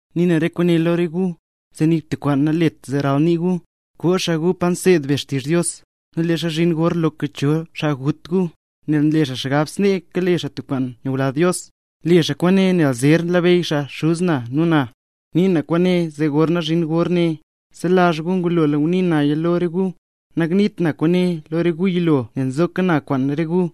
’Nii na re kwaane lo re gu, zee nik tub kwaan nalet zee ral nii gu. Koo xaa gu pa nseed be xtizh Dios, nu leezha zhin gor loka cho xaa gut gu, nel nle xaa xgab snee kale xaa tub kwaan nyula Dios. Le xaa kwaane nel zer labeyy xaa Xuz na nu na. Nii na kwaane zee gorna zhin gor ne, selazh gu ngulola ngunii naya lo re gu; nangniit na kwaane lo re gu yilo nel nzoka na kwaan re gu.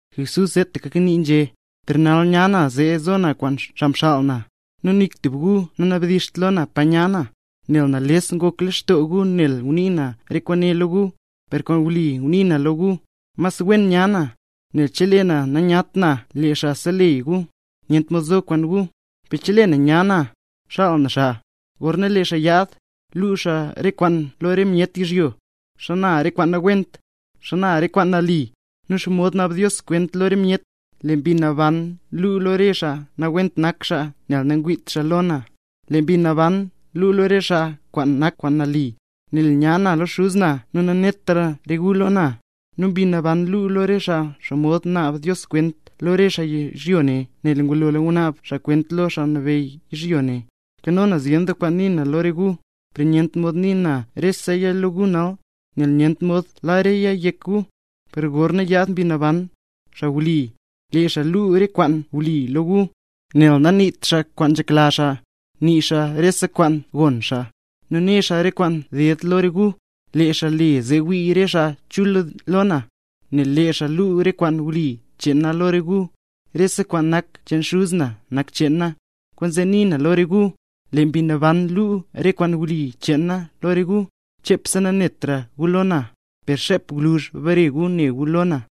Jesús seetaka kanii nu nzhé: —Per nal nya na zee zo na kwaan xaa mxaal na, nu nik tub gu nanabdizht lo na pa nya na; leel nales ngok lextoo gu nel ngunii na re kwaane lo gu. Per kwaan wli ngunii na lo gu, mas wen nya na. Nel chelee na nanyat na lee Xaa Seleyy gu, nyent mod zo kwaan gu; per chelee nya na, xaal na xaa. Gorna lee xaa yaad, luu xaa re kwaane lo re myet yizhyo: xana re kwaan nawent, xana re kwaan nali, nu xomod naab Dios kwent lo re myet. Lee Mbi Naban luu lo re xaa nawent nak xaa, nel nangwiit xaa lo na; lee Mbi Naban luu lo re xaa kwaan nak kwaan nali, nel nya na lo Xuz na nu nanetra re gu lo na; nu Mbi Naban luu lo re xaa xomod naab Dios kwent lo re xaa yizhyo ne, nel ngulola ngunaab xaa kwent lo xaa nabeyy yizhyo ne. ’Nkano na zyen doo kwaan nii na lo re gu, per nyent mod nii na reseya lo gu nal, nel nyent mod la reya yek gu. Per gorna yaad Mbi Naban, xaa wli, lee xaa luu re kwaan wli lo gu; nel naniit xaa kwaan nzhekla xaa, nii xaa rese kwaan gon xaa, nu né xaa re kwaan ded lo re gu. Lee xaa le zee wii re xaa chul lo na, nel lee xaa luu re kwaan wli cheen na lo re gu. Rese kwaan nak cheen Xuz na nak cheen na; kwaanzee nii na lo re gu, lee Mbi Naban luu re kwaan wli cheen na lo re gu. ’Xepse nanetra gu lo na, per xep gwluzh bare gu ne gu lo na.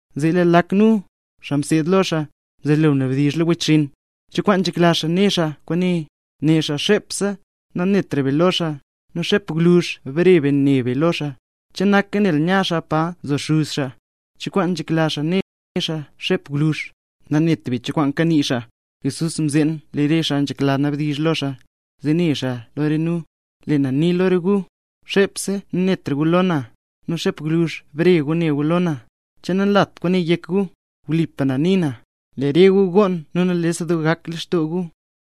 Zee lee lak nu, xaa mseed lo xaa, mzelo nabdizh lo wechxinn: —¿Cho kwaan nzhekla xaa né xaa kwaan re kwaane? Né xaa, xepse nanetra be lo xaa, nu xep gwluzh bare be ne be lo xaa, che naka nel nya xaa pa nzo Xuz xaa. ¿Cho kwaan nzhekla xaa né xaa “xep gwluzh”? Nanet be cho kwaan kanii xaa. Jesús mzeen lee re nu nzhekla nabdizh lo xaa, zee né xaa lo re nu: —Lee na nii lo re gu, xepse nanetra gu lo na, nu xep gwluzh bare gu ne gu lo na. ¿Che nanlat kwaane yek gu? Wlipa na nii na, lee re gu goon nu nales doo gak lextoo gu,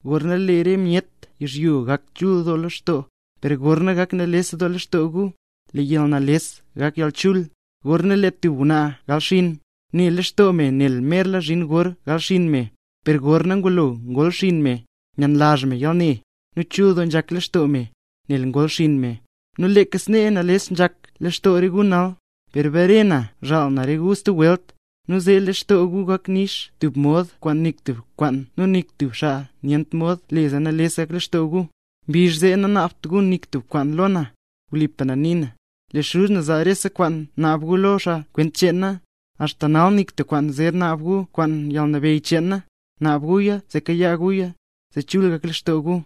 gorna lee re myet yizhyo gak chul doo lextoo. Per gorna gak nales lextoo gu, lee yalnales gak yalchul. Gorna lee tub ngwnaa gal xinn, ne lextoo me nel merla zhin gor gal xinn me, per gorna ngulo ngol xinn me, nyenlazh me yalne, nu chul doo nzhak lextoo me, nel ngol xinn me. Nu leeka snee nales nzhak lextoo re gu nal; per bare na zhaal na re gu stub welt, nu zee lee lextoo gu nix doo gak, tub mod kwaan nik tub kwaan nu nik tub xaa nyent mod le zee nales gak lextoo gu. ’Mbizh zee nanaabt gu nik tub kwaan lo na. Wlipa na nii na, lee Xuz na zaa rese kwaan naab gu lo xaa kwent cheen na. Axta nal nik tub kwaan zer naab gu kwaan yalnabeyy cheen na; naab guya zee kayaa guya, zee chul gak lextoo gu.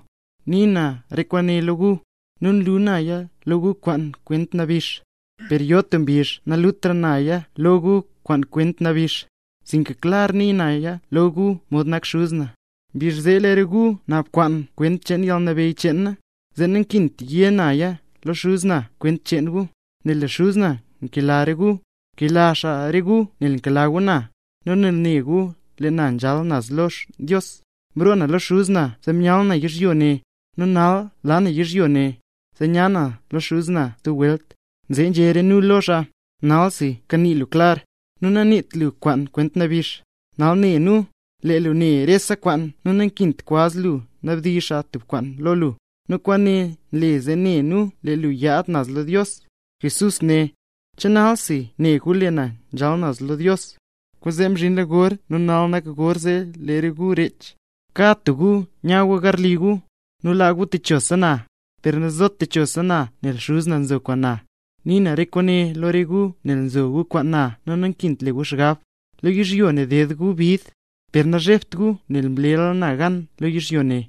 ’Nii na re kwaane lo gu, nu nlu naya lo gu kwaan kwent nabix; per yo tub mbizh nalutra naya lo gu kwaan kwent nabix, sinka klar nii naya lo gu mod nak Xuz na. Mbizh zee lee re gu naab kwaan kwent cheen yalnabeyy cheen na; zee nankint yé naya lo Xuz na kwent cheen gu, nel lee Xuz na nkela re gu. Nkela xaa re gu nel nkela gu na, nu nel ne gu lee na nzhal naz lo Dios. Mroo na lo Xuz na zee myal na yizhyo ne, nu nal laa na yizhyo ne, zee nya na naz lo Xuz na stub welt. Zee nzhé re nu lo xaa: —¡Nalsi kanii lu klar, nu naniit lu kwaan kwent nabix! Nal ne nu, lee lu ne rese kwaan nu nankint kwaz lu nabdizh xaa tub kwaan lo lu. Nu kwaane nle zee ne nu lee lu nyaad naz lo Dios. Jesús né: —¿Che nalsi ne gu lee na nzhal naz lo Dios? ¡Kwaanzee mzhinla gor nu nal nak gor zee lee re gu rech, kad tub gu nya gu garli gu, nu laa gu techosa na! Per nazot techosa na nel Xuz na nzo kwaan na. Nii na re kwaane lo re gu nel nzo gu kwaan na, nankint le gu xgab. Lo yizhyo ne ded gu bid; per nazhebt gu nel mlela na gan lo yizhyo ne.